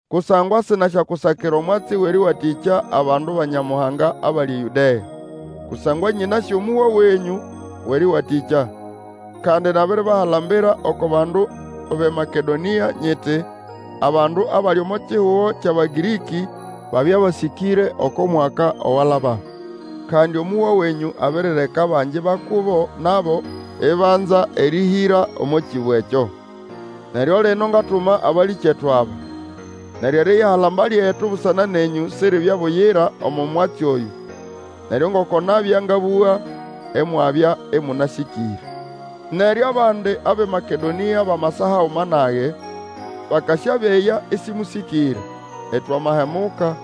Kusangwa sinangasyakusakira omwatsi wʼerĩwatĩkya abandu ba Nyamuhanga abali eYũdea. Kusangwa nyĩnasĩ omũhwa wenyũ wʼerĩwatĩkya, kandi nabiribahalambira oko bandu bʼeMakedonĩa. Nyiti, abandu abali omo kihugo kyʼAbagĩrĩkĩ, babya basĩkĩre oko mwaka owalaba. Kandi omũhwa wenyũ abirireka abangi ba kubo nabo ibanza erĩhĩra omo kĩbo ekyo. Neryo lino ngatuma abalĩkyetu aba, neryo eriyihalamba lyetu busana nenyũ siribye buyira omo mwatsi oyũ. Neryo ngoko nabya ngabũga, imwabya ĩmũnasĩkĩre. Neryo abandi abʼeMakedonĩa bamasa haguma nage, bakasyabeya ĩsĩmũsĩkĩre, itwamahemuka,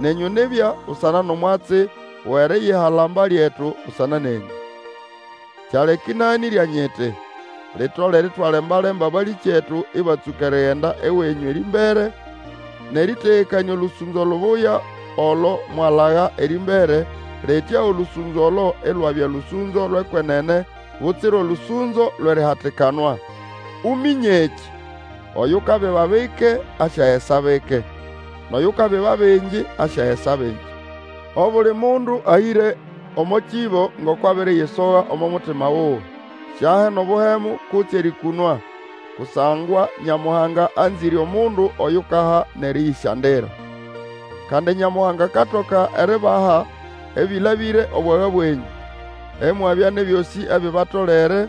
nenyũ nibya, busana nʼomwatsi wʼeriyihalamba lyetu busana nenyũ. Kyaleka ĩnaganĩrya nyiti, litolere itwalembalemba abalĩkyetu ĩbatsũka erigenda ewenyũ erĩmbere, nʼerĩtegekanĩa olũsũnzo lubuya olo mwalaga erĩmbere, litya olũsũnzo olo ilwabya lũsũnzo lwʼekwenene butsira olũsũnzo lwʼerihatikanwa. Uminye ekĩ, oyukabiba bike asyagesa bike; nʼoyukabiba bingi asyagesa bingi. Obuli mundu ahĩre omo kĩbo ngoko abiriyisoga omo mutima wuwe; siahe nʼobuhemu, kutse erĩkũnwa; kusangwa Nyamuhanga anzĩre omundu oyukaha nʼerĩyĩsyandira. Kandi Nyamuhanga akatoka eribaha ebĩlabĩre obwaga bwenyũ, imwabya nʼebyosĩ ebibatolere,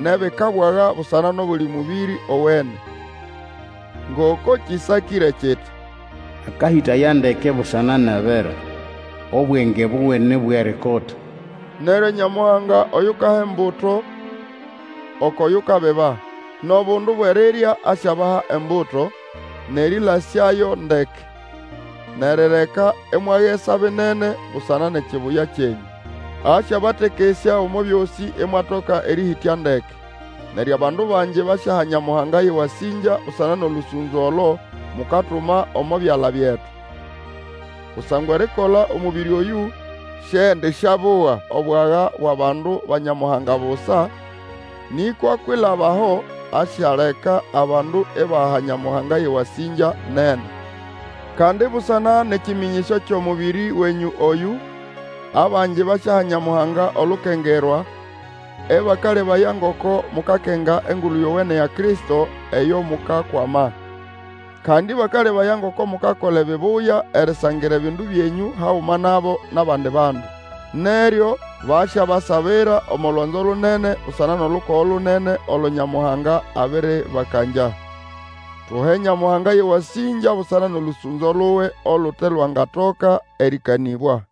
nʼebikabwaga busana nʼobuli mũbĩrĩ owene. Ngoko kĩsakĩre kiti, Akahĩtaya ndeke busana nʼabera, Obwenge buwe ni bwʼerikota. Neryo Nyamuhanga oyukaha embuto okwʼoyukabiba, nʼobundu bwʼerirya asyabaha embuto, nʼerĩlasyayo ndeke, nʼerireka imwagesa binene busana nʼekibuya kyenyũ. Asyabatekesya omo byosĩ imwatoka erĩhĩtya ndeke, neryo abandu bangi basyaha Nyamuhanga yʼewasĩngya busana nʼolũsũnzo olo mukatuma omo byala byetu. Kusangwa erikola omũbĩrĩ oyũ siendisyabuga obwaga bwʼabandu ba Nyamuhanga busa, nĩkwa kwilaba aho asyaleka abandu ibaha Nyamuhanga yʼewasĩngya nene. Kandi busana nʼekĩmĩnyĩsyo kyʼomũbĩrĩ wenyũ oyũ, abangi basyaha Nyamuhanga olukengerwa ĩbakalebaya ngoko mukakenga Engulu Yowene ya Kristo, eyo mukakwama. Kandi ĩbakalebaya ngoko mukakola ebibuya erisangira ebindu byenyũ haguma nabo nʼabandi bandu. Neryo basyabasabira omo lwanzo lunene busana nʼolukogo lunene olo Nyamuhanga abĩrĩbakangya. Tuhe Nyamuhanga yʼewasĩngya busana nʼolũsũnzo luwe olute lwangatoka erĩkanĩbwa.